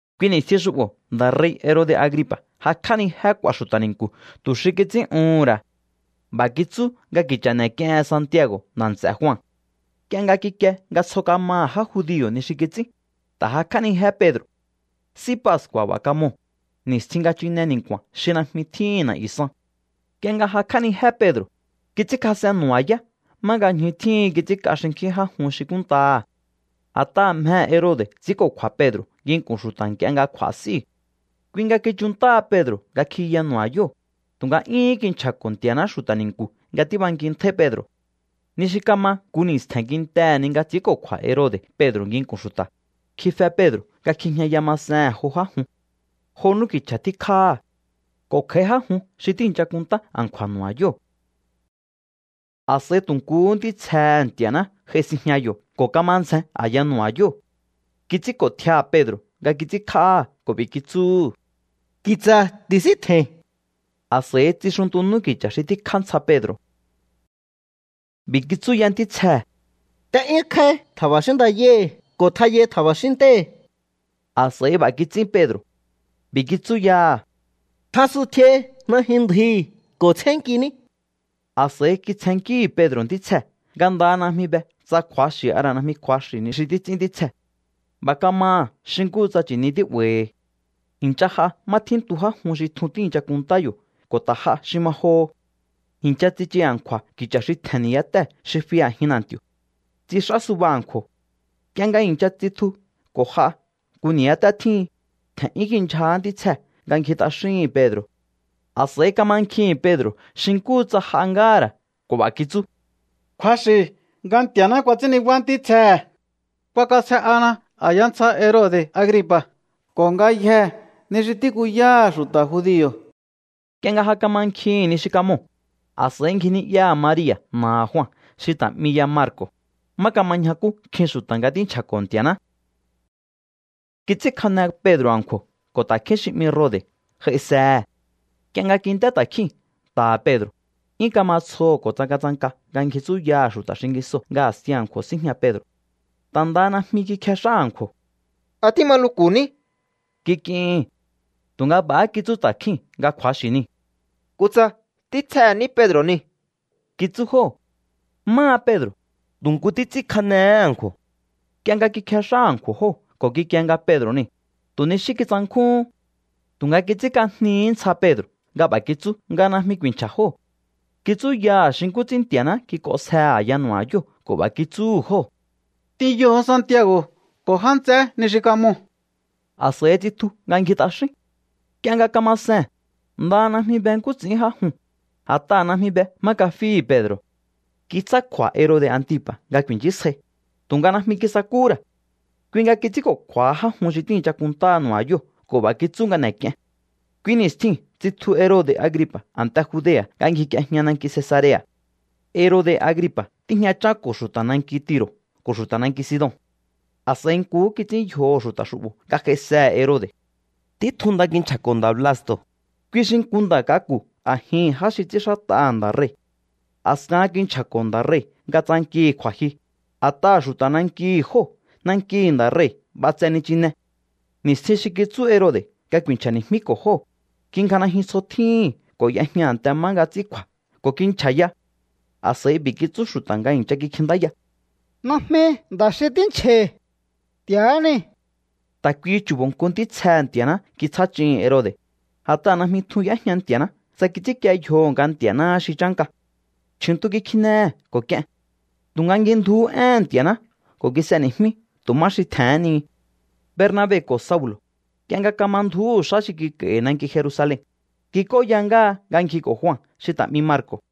Kui ni̱stjin xu'bo̱ nda̱ rei̱ Herode̱ Agripa̱ jakj'ánijé k'u̱a̱ xu̱ta̱ ni̱nku̱ tu̱ xi kits'ín'uhu̱n ra̱. B'a̱ kitsú nga ki̱cha̱ n'e̱k'iehen Santiago̱ nda̱ nts'e̱ Jua. Nk'ie nga kikie nga tsjo kamaha̱ já judio̱ ni xi kits'ín, ta̱ jakj'ánijé Pedro̱. S'í Pascu̱a̱ b'a̱ kamoo̱, ni̱stjin nga chine ni̱nku̱a̱n xi najmi tjíhi̱n na̱'yu̱ san. Nk'ie nga jakj'ánijé Pedro̱, kits'ínkjas'en nu̱ba̱yá má nga ñju tjíhin kits'ínk'a xinkjín já jun xi kúnntaha̱. A̱t'aha̱ mjehe̱ Herode̱ ts'i̱ínko̱kju̱a̱ Pedro̱ nginku̱n xu̱ta̱ nk'ie nga kj'u̱a̱ s'íu̱. Kui nga kichunntáha Pedro̱ nga kjiyaha nu̱ba̱yóo̱, tu̱nga 'yúhún kinchja̱ko̱ Nti̱a̱ná xu̱ta̱ ni̱nku̱ nga tíbankintjáí Pedro̱. Ni xi kama nku ni̱stje̱n kintehe̱ ni nga ts'i̱ínko̱kju̱a̱ Herode̱ Pedro̱ nginku̱n xu̱ta̱, kjife Pedro̱ nga kjijñaya masehe̱n jo já jun. Jo n'úki̱cha̱ tjíkjáha̱. Ko̱ kj'a̱í já jun xi tíi̱ncha kunntá a̱nkju̱a̱ nu̱ba̱yóo̱. A̱s'a̱i tu̱ nkuhú ntítsjehe̱ Nti̱a̱ná j'ai sinjña yo̱ ko̱ kama ndzjen a̱ya nu̱ba̱yóo̱. Kits'ínko̱ tjiaha̱ Pedro̱ nga kits'ínkj'áha̱ ko̱ b'i̱ kitsúhu̱: —Ki̱tsa̱ ti̱síntje̱i̱n. A̱s'a̱i tsixuntu n'úki̱cha̱ xi tjíkjá ntsja Pedro̱. B'i̱ kitsú ya ntítsjee̱: —T'e'yúnkjáí tja̱ba̱xín ndayáhi̱ ko̱ tjayai tja̱ba̱xín ntéhi̱. A̱s'a̱i b'a̱ kits'ín Pedro̱. B'i̱ kitsú yaha̱: —Tjasuntjiai najyun ndjuhi̱ ko̱ tsjénnkiní. A̱s'a̱i kitsjennkíhi̱ Pedro̱ ntítsjee̱ nga ndaha najmi be tsa kju̱axi̱ a ra̱ najmi kju̱axi̱ ni xi títs'ín ntítsjee̱. B'a̱ kamaha̱ xi nkúhu tsa chi̱ni tí'ba̱i̱hi̱. I̱ncha j'a má tjíntu já jun xi tjun tíi̱ncha kunntá yo̱ ko̱ ta̱ j'a xi ma joho. I̱ncha tsichu a̱nkju̱a̱ ki̱cha̱ xi tje̱n ni̱yáté xi fi a̱jin na̱nti̱o̱. Tsix'á suba a̱nkju̱o̱. Nk'ie nga i̱ncha tsitju ko̱ j'a nku ni̱yáté tjíhin, tje̱n'yún kindyjahá ntítsjee̱ nga ngji t'axíhi̱n Pedro̱. A̱s'a̱i kamankjihi̱n Pedro̱ xi nkúhu tsa j'a ngáha̱ ra̱ ko̱ b'a̱ kitsú: —Kju̱axi̱ nga Nti̱a̱ná kuats'ín nibá ntítsjehe̱. K'uakasje'ana a̱ya ntsja Herode̱ Agripa̱ ko̱ ngayjee̱ ni xi tíkuyáha̱ xu̱ta̱ judio̱. Nk'ie nga ja kamankjihi̱n ni xi kamoo̱, a̱s'a̱i ngji ni'yaha̱ Maria̱ na̱aha̱ Jua xi ta̱ 'mi ya Marco̱, má kama ñjakú nkjin xu̱ta̱ nga tínchja̱ko̱ Nti̱a̱ná. Kits'ínkjane Pedro̱ a̱nkju̱o̱ ko̱ ta̱kjín xi 'mi Rode̱ j'aisehe̱. Nk'ie nga kint'é ta̱kjíu̱n nta̱ha̱ Pedro̱, 'yún kama tsjoho̱ ko̱ tsangatsanka nga ngji tsúyaha̱ xu̱ta̱ xingisoo̱ nga a̱sti a̱nkju̱o̱ síjña Pedro̱. Ta̱ ndaha najmi kikjex'á a̱nkju̱o̱. —¿A tíma luku̱ ní? —kik'ihi̱n. Tu̱nga b'a̱há kitsú ta̱kjíu̱n nga kju̱axi̱ niu̱. —Kutsa ntítsjehe̱ ní Pedro̱ niu̱ —kitsú jóo̱. Máha Pedro̱, tu̱ nku títs'ínkjanehé a̱nkju̱o̱. Nk'ie nga kikjex'á a̱nkju̱o̱ jóo̱ ko̱ kikie nga Pedro̱ niu̱, tu̱ ni xí kitsankjúhún. Tu̱nga kits'ínk'ajnihí ntsja Pedro̱ nga b'a̱ kitsú nga najmi ku̱i̱nchja̱ jóo̱. Kitsúyaha̱ xi nkú ts'ín Nti̱a̱ná kik'onsjehe̱ a̱ya nu̱ba̱yóo̱ ko̱ b'a̱ kitsúhu̱ jóo̱: —T'inyoho̱o Santiago̱ ko̱ já nts'eé ni xi kamoo̱. A̱s'a̱i tsitju nga ngji t'axín. Nk'ie nga kama see̱n, ndaha najmi be nkú ts'i̱ín já juu̱n, a̱t'aha̱ najmi be má kafíhi̱ Pedro̱. Kitsjá kju̱a̱ Herode̱ Antipa̱ nga ku̱i̱nchísjai, tu̱nga najmi kisakúhú ra̱. Kui nga kits'ínko̱kju̱a̱ha já jun xi tíi̱ncha kunntá nu̱ba̱yóo̱ ko̱ b'a̱ kitsú nga n'e̱k'ien. Kui ni̱stjiu̱n tsitju Herode̱ Agripa̱ a̱nte Judea̱ nga ngjik'iejña nanki Cesarea̱. Herode̱ Agripa̱ tíjñachánko̱ xu̱ta̱ nanki Tiro̱ ko̱ xu̱ta̱ nanki Sidon. A̱s'a̱i nkuhú kits'ín yjoho̱ xu̱ta̱ xu'bo̱ nga j'aisehe̱ Herode̱. Títjun nda kinchja̱ko̱ nda̱ Blasto̱, kui xi nku nda̱ k'aku̱ a̱jihi̱n já xi ts'ínxát'aha̱ nda̱ rei̱. A̱skahan kinchja̱ko̱ nda̱ rei̱ nga tsankihi̱ kju̱a̱jyu, a̱t'aha̱ xu̱ta̱ nankihi̱ jóo̱ nankihi̱ nda̱ rei̱ b'atse nichine. Ni̱stjin xi kitsú Herode̱ nga ku̱i̱nchja̱ni̱jmíko̱ jóo̱, kingja najyun tsjo tjíhi̱n ko̱ y'ejña a̱nte má nga ts'ín kju̱a̱ ko̱ kinchja̱ya. A̱s'a̱i b'i̱ kitsú xu̱ta̱ nga i̱ncha kikjintáya: —Najmi nda̱ xi tínchja̱i̱. Nti̱a̱há niu̱. Ta̱ kuihi chu̱bo̱ nku ntítsjehe̱ Nti̱a̱ná kitsjá ch'ihi̱n Herode̱, a̱t'aha̱ najmi tjun y'éjña Nti̱a̱ná tsa kits'ínkie yjoho̱ nga Nti̱a̱náhá xi chánka. Chju̱ntu kikjinehe̱ ko̱ k'ien. Tu̱nga ngjindjuhú éhe̱n Nti̱a̱ná ko̱ kis'eni̱jmí tu̱ má xi tje̱hén ni. Bernabe ko̱ Saulo̱, nk'ie nga kama ndju̱úhu̱ xá xi kik'a̱i̱hi̱ nanki Jerusalen, kik'óya ngáha nga ngjiko̱ Jua xi ta̱ 'mi Marco̱.